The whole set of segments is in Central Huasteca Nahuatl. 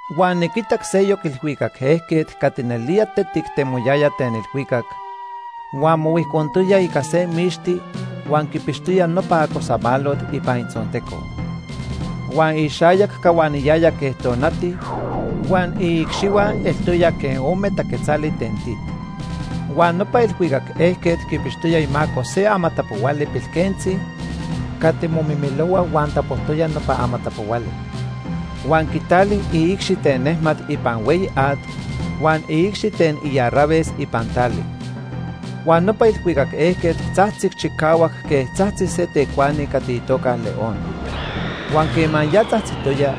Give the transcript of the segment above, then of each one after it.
Huan niquitac seyoc ilhuicac ejquet cati nelía tetic temoyaya ten ilhuicac, huan mohuijcontoya ica se mixti huan quipixtoya nopa acosamalot ipan itzonteco. Huan ixayac cahuaniyaya quej tonati huan iicxihua eltoya quej ome taquetzali ten tit. Huan nopa ilhuicac ejquet quipixtoya imaco se amatapohuali pilquentzi cati momimilohua huan tapojtoya nopa amatapohuali. Huan quitali iicxi ten nejmat ipan hueyi at huan iicxi ten iarraves ipan tali. Huan nopa ilhuicac ejquet tzajtzic chicahuac quej tzajtzi se tecuani cati itoca león. Huan quema ya tzajtzitoya,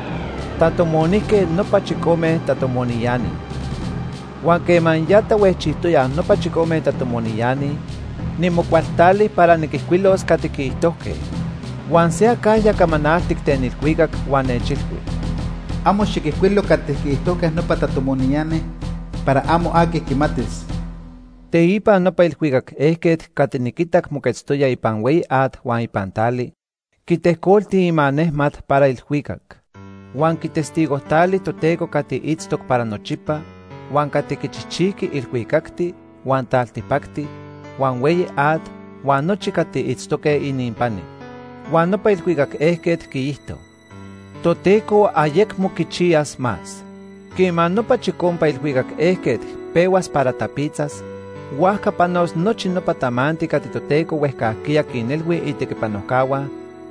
tatomonijque nopa chicome tatomoniani. Huan quema ya tahuejchijtoyaj nopa chicome tatomoniani, nimocualtali para niquijcuilos cati quiijtojque. Huan se acajya camanaltic ten ilhuicac huan nechilhui: “Amo xiquijcuilo cati quiijtojque nopa tatomoniani para amo aqui quimatis.” Teipa nopa ilhuicac ejquet cati niquitac moquetztoya ipan hueyi at huan ipan tali, quitejcolti imanejmat para ilhuicac. Huan quitestigojtali Toteco cati itztoc para nochipa huan cati quichijchijqui ilhuicacti, huan taltipacti, huan hueyi at huan nochi cati itztoque ininpani. Huan nopa ilhuicac ejquet quiijto: “Toteco ayecmo quichiyas más. Quema nopa chicompa ilhuicac ejquet pehuas para tapitzas, huajca panos nochi nopa tamanti cati Toteco huejcajquiya quinilhui itequipanojcahua,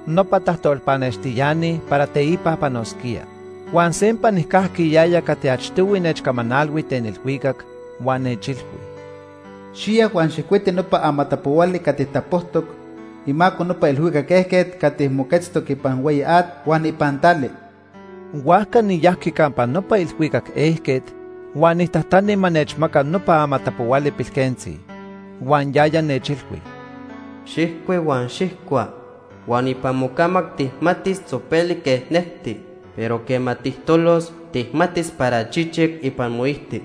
nopa tajtolpanextiani, para teipa panosquía.” Huan sempa nijcajqui yaya cati achtohui nechcamanalhui ten ilhuicac, huan nechilhui: “Xiya huan xijcuiti nopa amatapohuali cati tapojtoc imaco nopa ilhuicac ejquet cati moquetztoc ipan hueyi at huan ipan tali.” Huajca niyajqui campa nopa ilhuicac ejquet huan nijtajtani ma nechmaca nopa amatapohuali pilquentzi. Huan yaya nechilhui: “Xijcui huan xijcua. Huan ipan mocamac tijmatis tzopelic quej necti, pero quema tijtolos, tijmatis para chichic ipan moijti.”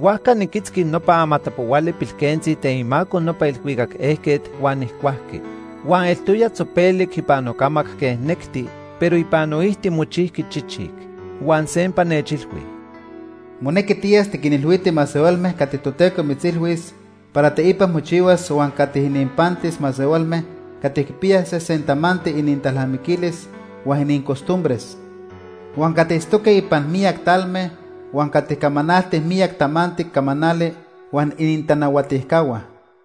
Huajca niquitzqui nopa amatapohuali pilquentzi ten imaco nopa ilhuicac ejquet huan nijcuajqui. Huan eltoya tzopelic ipan nocamac quej necti, pero ipan noijti mochijqui chichic. Huan sempa nechilhui: “Monequi tiyas tiquinilhuiti masehualme cati Toteco mitzilhuis para teipa mochihuas huan cati ininpantis masehualme cati quipiyaj sesen tamanti inintalnamiquilis huan inincostumbres, huan cati itztoque ipan miyac talme huan cati camanaltij miyac tamanti camanali huan inintanahuatijcahua.”